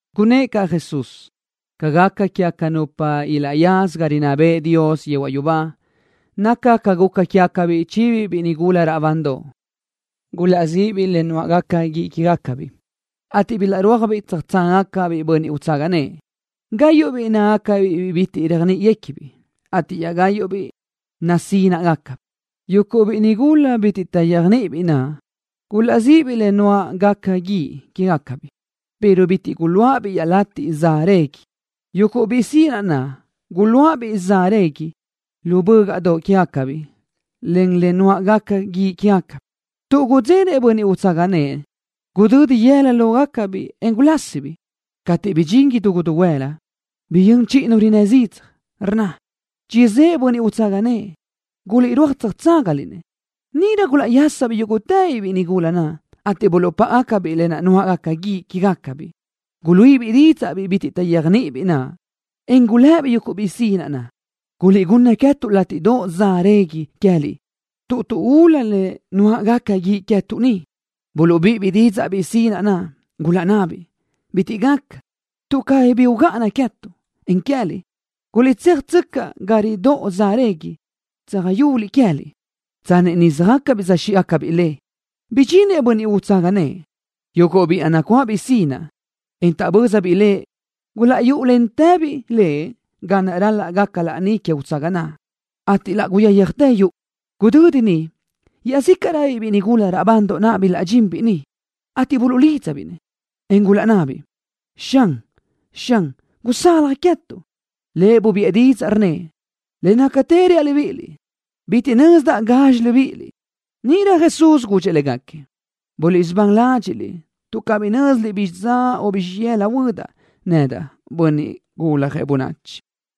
Gunnë́ʼ caʼ Jesús: —Ca gaca quégaca nupa ilaʼyaza ga rinná bëʼë Dios yehuaʼ yubá naca ca guca quégacabiʼ chibiʼ biʼi nigula raʼbandoʼ. Gulaʼzíʼibiʼ le nuáʼgaca guíʼ quégacabiʼ, ateʼ bilaʼrúajbiʼ tsöjtságagacabiʼ bönniʼ utsaga nëʼë. Gáyuʼbiʼ nácagacabiʼ biʼi bitiʼ taʼyéajniʼibiʼ ateʼ iaʼgáyuʼbiʼ nasínaʼgacabiʼ. Yuguʼ biʼi nigula bitiʼ taʼyéajniʼibiʼ naʼ gulaʼzíʼibiʼ le nuáʼgaca guíʼ quégacabiʼ pero bitiʼ guluáʼabiʼ iaʼlatiʼ za régui. Yuguʼ biʼi sinaʼ naʼ guluáʼabiʼ za régui lu bö́gaʼdoʼ quégacabiʼ len le nuáʼgaca guíʼ quégacabiʼ. Tuʼ gudzenëʼ bönniʼ utsaga nëʼë, gudödi yëla lógacabiʼ, en gulásitëbiʼ. Cateʼ bidxín idú guluhuëla, biyö́n chiʼi nu rinnë́ zidzaj, rnna: “¡Chizë́ʼë bönniʼ utsaga nëʼë! ¡Guliʼrúaj tsöjtságaliʼ-nëʼ!” Níʼirö gulaʼyásabiʼ yúguʼtëbiʼ biʼi nigula naʼ, ateʼ buluʼpáʼabiʼ le nuáʼgaca guíʼ quégacabiʼ. Guluíʼibiʼ didzaʼ biʼi bitiʼ taʼyéajniʼibiʼ naʼ, en gulëbiʼ yuguʼ biʼi sinaʼ naʼ: “Guliʼgunna queë́tuʼ látiʼdoʼ za régui queë́liʼ tuʼ tuʼúlu le nuáʼgaca guíʼ queë́tuʼ ni.” Buluʼbíʼibiʼ didzaʼ biʼi sinaʼ naʼ, gulaʼnnabiʼ: “Bitiʼ gaca, tuʼ cabí bi ugáʼana queë́tuʼ, en queë́liʼ. Guliʼtséajtsöcaʼ ga ridóʼo za régui, tsöjö́ʼuliʼ queë́liʼ.” Tsanni niʼ söjácabiʼ söjxíʼgacabiʼ le, bidxinëʼ bönniʼ utsaga nëʼë. Yuguʼ biʼi naʼ nacuáʼabiʼ sinaʼ, en taʼbö́zabiʼ lëʼ gulaʼyúʼulentëbiʼ lëʼ ga naʼ raca laní que utsaga naʼ, ateʼ laʼ guyáyajtë yuʼu. Gudödi niʼ iaʼzícaʼröbiʼ biʼi nigula raʼbandoʼ naʼ bilaʼdxinbiʼ niʼ, ateʼ buluʼlídzabiʼ-nëʼ, en gulaʼnnabiʼ: “Xan, Xan, gusalaj queë́tuʼ.” Lëʼ bubiʼë didzaʼ, rnnëʼ: “Le nácatë reaʼ libíʼiliʼ, bitiʼ nözdaʼ gazxi libíʼiliʼ.” Níʼirö Jesús gudxëʼ légaquiëʼ: —Buliʼsubán ládxiʼliʼ, tuʼ cabí nö́ziliʼ bizxi dza o bizxi yëla huödaʼ nedaʼ, Bönniʼ Guljëʼ Bönachi.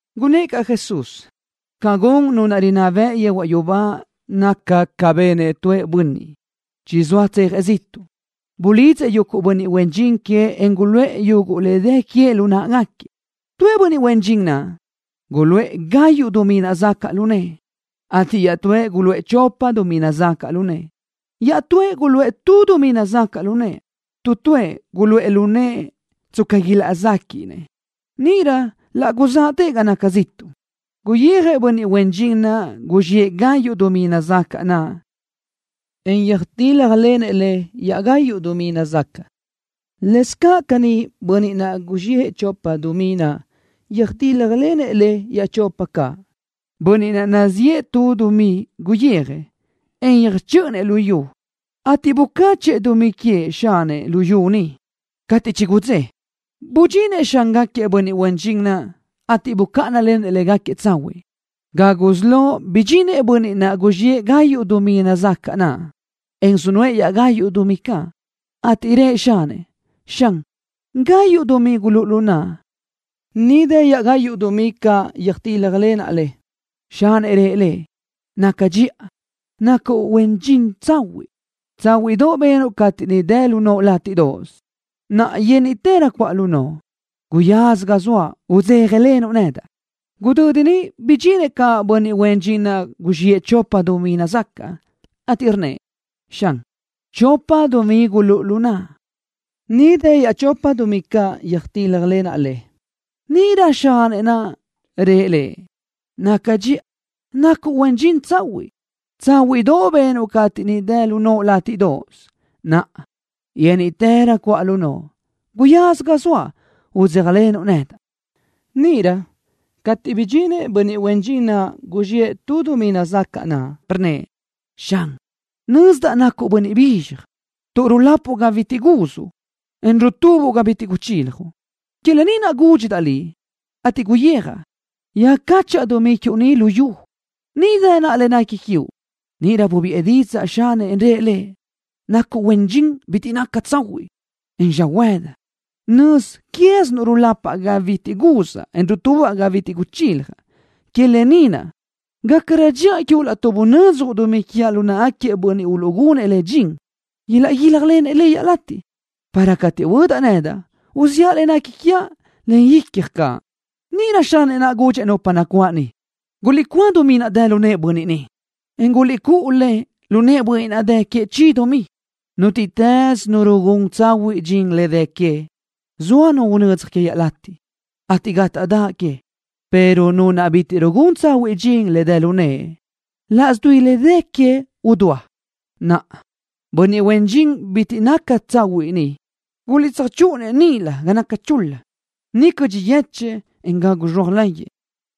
Gunnë́ʼ caʼ Jesús: —Ca gun Nu naʼ rinná bëʼ yehuaʼ yubá naca ca benëʼ tu bönniʼ, chizóa tsejëʼ ziʼtuʼ. Bulidzëʼ yuguʼ bönniʼ huen dxin queëʼ en guluʼë yuguʼ le dë queëʼ lu náʼagaquiëʼ. ’Tuëʼ bönniʼ huen dxin naʼ, guluʼë gayuʼ dumí nazacaʼ lu nëʼë, ateʼ iaʼtúëʼ guluʼë chopa dumí nazacaʼ lu nëʼë. Iaʼtúëʼ guluʼë tu dumí nazacaʼ lu nëʼë. Tu tuëʼ guluʼë lu nëʼë tsca huéaj le ilaʼzéquiʼnëʼ. Níʼirö laʼ guzáʼatëʼ ga naca ziʼtuʼ. Guyijëʼ bönniʼ huen dxin naʼ guzxiʼë gayuʼ dumí nazacaʼ naʼ, en yöjtíljalenëʼ le iaʼgayuʼ dumí nazacaʼ. Lëscaʼ caní, bönniʼ naʼ guzxiʼë chopa dumí naʼ, yöjtíljalenëʼ le iaʼchopa caʼ. Bönniʼ naʼ guzxiʼë tu dumí guyijëʼ, en yöjchö́ʼönëʼ lu yu, ateʼ bucáchëʼë dumí queëʼ xanëʼ lu yu niʼ. ’Cateʼ chigudzé, budxinëʼ xángaquiëʼ bönniʼ huen dxin naʼ, ateʼ bucáʼanalenëʼ légaquiëʼ tsahuiʼ. Ga gusí lo bidxintëʼ bönniʼ naʼ guzxiʼë gayuʼ dumí nazacaʼ naʼ, en sunuʼë iaʼgayuʼ dumí caʼ, ateʼ rëʼ xanëʼ: “Xan, gayuʼ dumí gulúʼu lu naʼa. Ni dë iaʼgayuʼ dumí caʼ yöjtíljalenaʼ le.” Xanëʼ naʼ rëʼ lëʼ: “Naca dxiʼa. Nacuʼ huen dxin tsahuiʼ. Tsáhuiʼdoʼ benuʼ cateʼ ni dë lu noʼo látiʼdoʼos. Naʼa yénniʼtërö cuʼa lu noʼo. Guyaza ga zoaʼ, udzéjalenuʼ nedaʼ.” Gudödi niʼ bidxinëʼ caʼ bönniʼ huen dxin naʼ guzxiʼë chopa dumí nazacaʼ, ateʼ rnnëʼ: “Xan, chopa dumí gulúʼu lu naʼa. Ni dë iaʼchopa dumí caʼ yöjtíljalenaʼ le.” Níʼirö xanëʼ naʼ rëʼ lëʼ: “Naca dxiʼa. Nacuʼ huen dxin tsahuiʼ. Tsáhuiʼdoʼ benuʼ cateʼ ni dë lu noʼo látiʼdoʼos. Naʼa, yénniʼtërö cuʼa lu noʼo. Guyaza ga zoaʼ, udzéjalenuʼ nedaʼ.” Níʼirö cateʼ bidxinëʼ bönniʼ huen dxin naʼ guzxiʼë tu dumí nazacaʼ naʼ, rnnëʼ: “Xan, nözdaʼ nacuʼ bönniʼ bizxaj, tuʼ rulapuʼ ga bitiʼ guzuʼ, en rutubuʼ ga bitiʼ guchiljuʼ. Que lë ni naʼ gúdxidaʼ liʼ, ateʼ guyijaʼ, yöjcáchaʼa dumí quiuʼ lu yu. Ni dë naʼa le nequi quiuʼ.” Níʼirö bubiʼë didzaʼ xanëʼ, en rëʼ lëʼ: “Nacuʼ huen dxin bitiʼ naca tsahuiʼ, en xöhuëdi. Nöz quézinuʼ rulapaʼ ga bitiʼ guzaʼ, en rutubaʼ ga bitiʼ guchiljaʼ. Que lë ni naʼ, gácarö dxiʼa quiuʼ laʼtuʼ bunödzjuʼ dumí quiaʼ lu náʼagaquiëʼ bönniʼ uluʼgunëʼ le dxin, ilaʼguíljalenëʼ le iaʼlatiʼ, para cateʼ huödaʼ nedaʼ, uziʼa le nequi quiaʼ len icja caʼ.” Níʼirö xanëʼ naʼ gudxëʼ nupa nacuáʼ niʼ: “Guliʼcúa dumí naʼ dë lu nëʼë bönniʼ ni, en guliʼcúʼu le lu nëʼë bönniʼ naʼ dë queëʼ chi dumí.” Nútiʼtës nu rugún tsahuiʼ dxin le dë queëʼ, zoa nu unödzaj queëʼ iaʼlatiʼ, ateʼ gátaʼdaʼ queëʼ, pero nu naʼ bitiʼ rugún tsahuiʼ dxin le dë lu nëʼe, laʼs dui le dë queëʼ idúa. Naʼa, bönniʼ huen dxin bitiʼ naca tsahuiʼ ni, guliʼtsöjchúʼuna-nëʼ níʼilö ga naca chul-la. Niʼ cödxi yéchëʼë, en gagu zxea láyëʼë.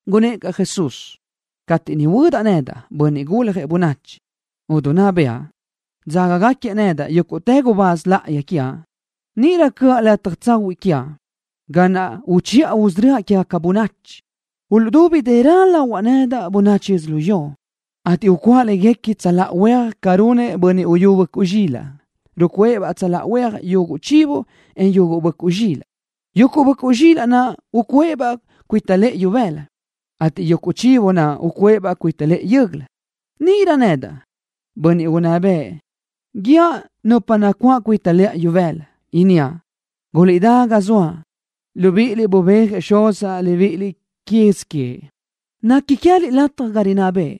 Gunnë́ʼ caʼ Jesús: —Cateʼ niʼ huödaʼ nedaʼ, Bönniʼ Guljëʼ Bönachi, idinná bëʼa, ateʼ dzágagaquiëʼ nedaʼ yúguʼtë gubáz láʼayi quiaʼ, níʼirö cöʼa lataj tsahuiʼ quiaʼ, ga naʼ uchiʼa usörö́aʼ quégaca bönachi. Uluʼdubi dërö lahuaʼ nedaʼ bönachi yödzölió ni, ateʼ ucuʼa léguequi tsöláʼa huéaj ca runëʼ bönniʼ uyú böʼcuʼ zxilaʼ, rucuʼë-baʼ tsöláʼa huéajbaʼ yuguʼ chivo, en yuguʼ böʼcuʼ zxilaʼ. Yuguʼ böʼcuʼ zxilaʼ naʼ ucuʼë-baʼ cuita lëʼë ibëla, ateʼ yuguʼ chivo naʼ ucuʼë-baʼ cuita lëʼë yö́göla. Níʼirö, nedaʼ, bönniʼ unná bëʼ, guíaʼ nupa nacuáʼ cuita lëʼa ibëla, inníaʼ: “Guliʼdá ga zoaʼ, libíʼiliʼ bubéajëʼ Xuzaʼ libíʼiliʼ quez queëʼ. Nequi queë́liʼ lataj ga naʼ rinná bëʼë,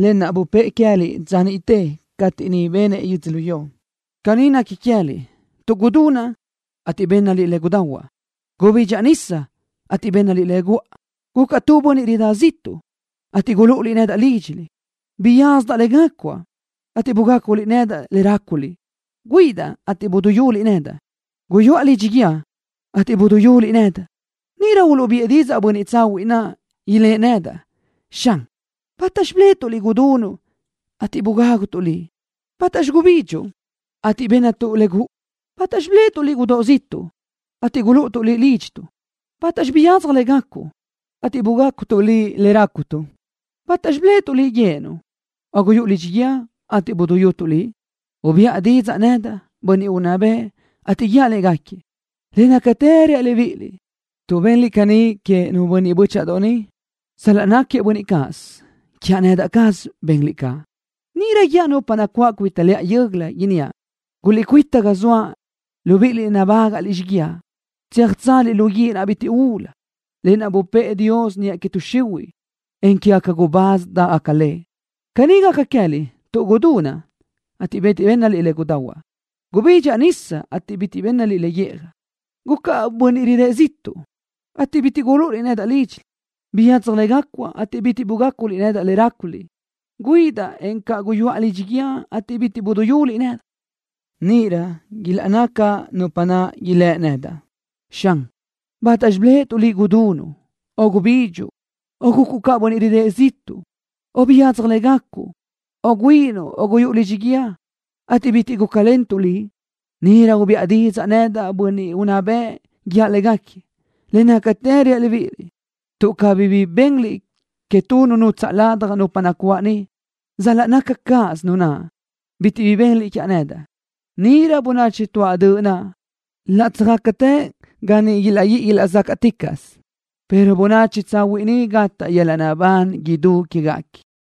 lë naʼ bupë́ʼë queë́liʼ dza niʼte cateʼ niʼ benëʼ yödzölió. Caní nequi queë́liʼ tuʼ gudunaʼ, ateʼ bénnaliʼ le gudahuaʼ. Gubidxaʼ nisa, ateʼ bénnaliʼ le guʼa. Gucaʼ ca tu bönniʼ ridá ziʼtuʼ, ateʼ gulúʼuliʼ nedaʼ lídxiliʼ. Biyadzaj le gácuaʼ, ateʼ bugáculiʼ nedaʼ le ráculiʼ. Güíʼidaʼ, ateʼ buduyúliʼ nedaʼ. Guyuʼa lidxi guíë, ateʼ buduyúliʼ nedaʼ.” Níʼirö uluʼbiʼë didzaʼ bönniʼ tsahuiʼ naʼ, ilë́ʼ nedaʼ: “Xan, ¿bátaxi biléʼetuʼ Liʼ gudunuʼ, ateʼ bugágutuʼ Liʼ? ¿Bátaxi gubidxuʼ, ateʼ bénnatuʼ le guʼu? ¿Bátaxi biléʼetuʼ Liʼ gudóʼ ziʼtuʼ, ateʼ gulúʼutuʼ Liʼ lídxituʼ? ¿Bátaxi biyadzaj le gacuʼ, ateʼ bugácutuʼ Liʼ le rácutuʼ? ¿Bátaxi biléʼetuʼ Liʼ güíʼinuʼ, o guyúʼu lidxi guíë, ateʼ buduyútuʼ Liʼ?” Ubiʼa didzaʼ nedaʼ, bönniʼ unná bëʼ, ateʼ guíaʼ légaquiëʼ: “Le nácatë reaʼ libíʼiliʼ, tuʼ benliʼ caní queëʼ nu bönniʼ bö́chaʼadoʼ ni, sal-laʼ náquiëʼ bönniʼ cáʼasö, quiaʼ nedaʼ caz benliʼ caʼ.” ’Níʼirö guíaʼ nupa nacuáʼ cuita lëʼa yö́göla, inníaʼ: “Guliʼcuíta ga zoaʼ, libíʼiliʼ naʼ nabágaʼliʼ xíguiaʼ, tsöjtsázaliʼ lu guíʼ naʼ bitiʼ ulu, lë naʼ bupë́ʼë Dios niʼa que tuʼ xihuiʼ, en quéguequi gubáz dáʼgaca le. Caní gaca queë́liʼ tuʼ gudunaʼ, ateʼ bitiʼ bénnaliʼ le gahuaʼ. Gubidxaʼ nisa, ateʼ bitiʼ bénnaliʼ le guíʼjaʼ. Gucaʼ ca bönniʼ ridë́ʼ ziʼtuʼ, ateʼ bitiʼ gulúʼuliʼ nedaʼ lídxiliʼ. Biyadzaj le gácuaʼ, ateʼ bitiʼ bugáculiʼ nedaʼ le ráculiʼ. Güíʼidaʼ, encaʼ guyuʼa lidxi guíë, ateʼ bitiʼ buduyúliʼ nedaʼ.” Níʼirö ilaʼnná caʼ nupa naʼ, ilë́ nedaʼ: “Xan, ¿bátaxi biléʼetuʼ Liʼ gudunuʼ, o gubidxuʼ, o gucuʼ ca bönniʼ ridë́ʼ ziʼtuʼ, o biyadzaj le gacuʼ, o güíʼinuʼ, o guyúʼu lidxi guíë, ateʼ bitiʼ gúcalentuʼ Liʼ?” Níʼirö ubiʼa didzaʼ nedaʼ, bönniʼ unná bëʼ, guíaʼ légaquiëʼ: “Le nácatë reaʼ libíʼiliʼ, tuʼ cabí bi benliʼ que tu nu nutsaʼ ladaj nupa nacuáʼ ni, sal-laʼ naca cáʼasö nu naʼ, bitiʼ bi benliʼ quiaʼ nedaʼ.” Níʼirö bönachi tuáʼ döʼ naʼ laʼ tsöjtsázagacatë ga niʼ ilaʼguíʼi ilaʼzácaʼticaʼsö, pero bönachi tsahuiʼ niʼ gataʼ yöl-laʼ naʼbán idú quéguequi.